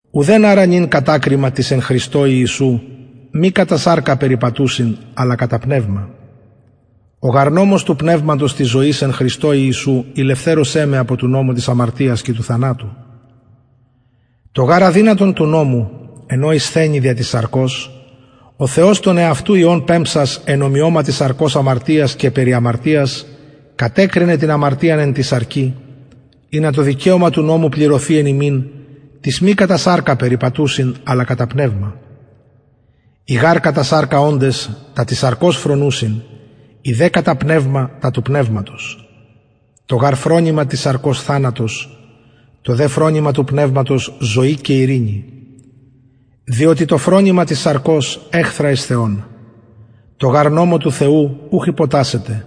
ουδεν αρα νυν κατακριμα τοις εν χριστω ιησου μη κατα σαρκα περιπατουσιν αλλα κατα πνευμα ο γαρ νομος του πνευματος της ζωης εν χριστω ιησου ηλευθερωσεν με απο του νομου της αμαρτιας και του θανατου το γαρ αδυνατον του νομου εν ω ησθενει δια της σαρκος ο θεος τον εαυτου υιον πεμψας εν ομοιωματι σαρκος αμαρτιας και περι αμαρτιας κατεκρινεν την αμαρτιαν εν τη σαρκι ινα το δικαιωμα του νομου πληρωθη εν ημιν τοις μη κατα σαρκα περιπατουσιν αλλα κατα πνευμα οι γαρ κατα σαρκα οντες τα της σαρκος φρονουσιν οι δε κατα πνευμα τα του πνευματος το γαρ φρονημα της σαρκος θανατος το δε φρονημα του πνευματος ζωη και ειρηνη διοτι το φρονημα της σαρκος εχθρα εις θεον τω γαρ νομω του θεου ουχ υποτασσεται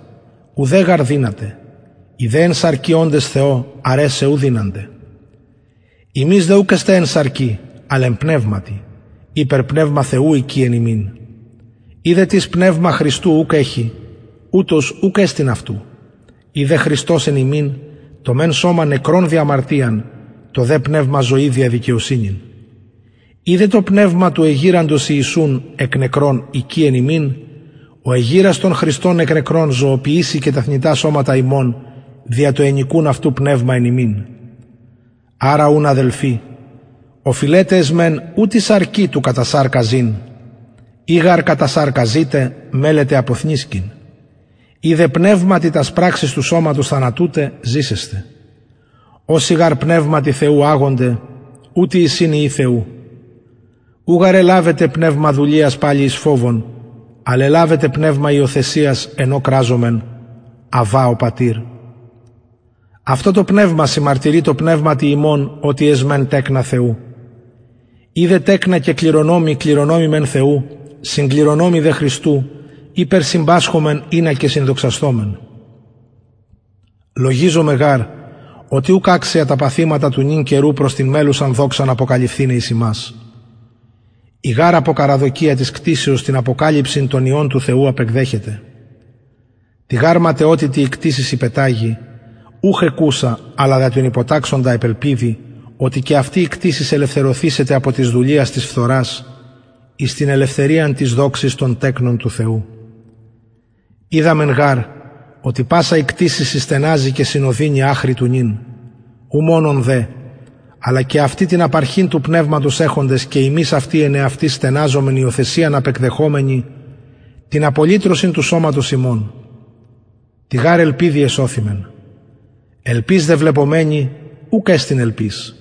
ουδε γαρ δυναται οι δε εν σαρκι οντες θεω αρεσαι ου δυνανται υμεις δε ουκ εστε εν σαρκι αλλ εν πνευματι ειπερ πνευμα θεου οικει εν υμιν ει δε τις πνευμα χριστου ουκ εχει ουτος ουκ εστιν αυτου ει δε χριστος εν υμιν το μεν σωμα νεκρον δια αμαρτιαν το δε πνευμα ζωη δια δικαιοσυνην ει δε το πνευμα του εγειραντος ιησουν εκ νεκρων οικει εν υμιν ο εγειρας τον χριστον εκ νεκρων ζωοποιησει και τα θνητα σωματα υμων δια το ενοικουν αυτου πνευμα εν υμιν αρα ουν αδελφοι οφειλεται εσμεν ου τη σαρκι του κατα σαρκα ζην ει γαρ κατα σαρκα ζητε μελλετε αποθνησκειν ει δε πνευματι τας πραξεις του σωματος θανατουτε ζησεσθε οσοι γαρ πνευματι θεου αγονται ουτοι εισιν υιοι θεου ου γαρ ελαβετε πνευμα δουλειας παλιν εις φοβον αλλ ελαβετε πνευμα υιοθεσιας εν ω κραζομεν αββα ο πατηρ αυτο το πνευμα συμμαρτυρει τω πνευματι ημων οτι εσμεν τεκνα θεου ει δε τεκνα και κληρονομοι κληρονομοι μεν θεου συγκληρονομοι δε χριστου ειπερ συμπασχομεν ινα και συνδοξασθωμεν λογιζομαι γαρ οτι ουκ αξια τα παθηματα του νυν καιρου προς την μελλουσαν δοξαν αποκαλυφθηναι εις ημας η γαρ αποκαραδοκια της κτισεως την αποκαλυψιν των υιων του θεου απεκδεχεται τη γαρ ματαιοτητι η κτισις υπεταγη ουχ εκουσα αλλα δια τον υποταξαντα επ ελπιδι οτι και αυτη η κτισις ελευθερωθησεται απο της δουλειας της φθορας εις την ελευθεριαν της δοξης των τεκνων του θεου οιδαμεν γαρ οτι πασα η κτισις συστεναζει και συνωδινει αχρι του νυν ου μονον δε αλλα και αυτοι την απαρχην του πνευματος εχοντες και ημεις αυτοι εν εαυτοις στεναζομεν υιοθεσιαν απεκδεχομενοι την απολυτρωσιν του σωματος ημων τη γαρ ελπιδι εσωθημεν ελπις δε βλεπομενη ουκ εστιν ελπις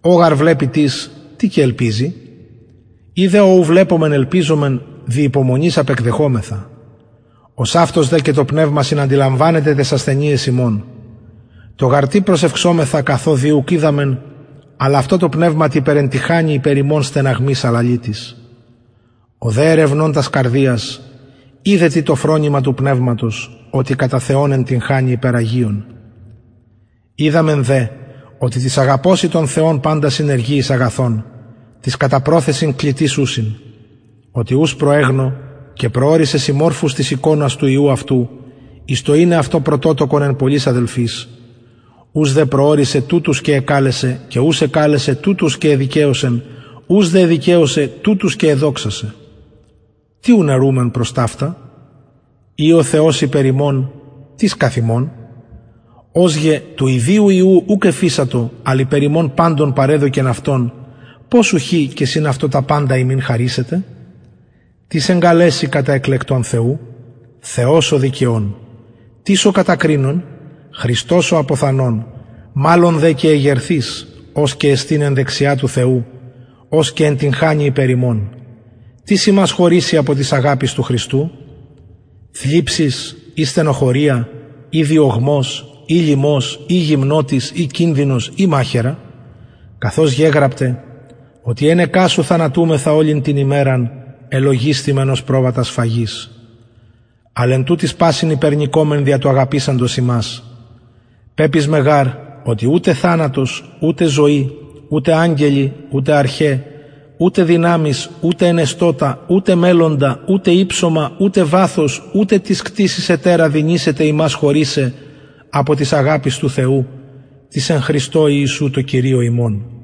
ο γαρ βλεπει τις τι και ελπιζει ει δε ο ου βλεπομεν ελπιζομεν δι υπομονης απεκδεχομεθα ωσαυτως δε και το πνευμα συναντιλαμβανεται ταις ασθενειαις ημων το γαρ τι προσευξομεθα καθο δει ουκ οιδαμεν αλλ αυτο το πνευμα υπερεντυγχανει υπερ ημων στεναγμοις αλαλητοις ο δε ερευνων τας καρδιας οιδεν τι το φρονημα του πνευματος οτι κατα θεον εντυγχανει υπερ αγιων οιδαμεν δε οτι τοις αγαπωσιν τον θεον παντα συνεργει εις αγαθον τοις κατα προθεσιν κλητοις ουσιν οτι ους προεγνω και προωρισεν συμμορφους της εικονος του υιου αυτου εις το ειναι αυτον πρωτοτοκον εν πολλοις αδελφοις ους δε προωρισεν τουτους και εκαλεσεν και ους εκαλεσεν τουτους και εδικαιωσεν ους δε εδικαιωσεν τουτους και εδοξασεν τι ουν ερουμεν προς ταυτα ει ο θεος υπερ ημων τις καθ ημων ος γε του ιδιου υιου ουκ εφεισατο αλλ υπερ ημων παντων παρεδωκεν αυτον πως ουχι και συν αυτω τα παντα ημιν χαρισεται τις εγκαλεσει κατα εκλεκτων θεου θεος ο δικαιων τις ο κατακρινων χριστος ο αποθανων μαλλον δε και εγερθεις ος και εστιν εν δεξια του θεου ος και εντυγχανει υπερ ημων τις ημας χωρισει απο της αγαπης του χριστου θλιψις η στενοχωρια η διωγμος η λιμος η γυμνοτης η κινδυνος η μαχαιρα καθως γεγραπται οτι ενεκεν σου θανατουμεθα ολην την ημεραν ελογισθημεν ως προβατα σφαγης αλλ εν τουτοις πασιν υπερνικωμεν δια του αγαπησαντος ημας πεπεισμαι γαρ οτι ουτε θανατος ουτε ζωη ουτε αγγελοι ουτε αρχαι ουτε δυναμεις ουτε ενεστωτα ουτε μελλοντα ουτε υψωμα ουτε βαθος ουτε τις κτισις ετερα δυνησεται ημας χωρισαι απο της αγαπης του θεου της εν χριστω ιησου τω κυριω ημων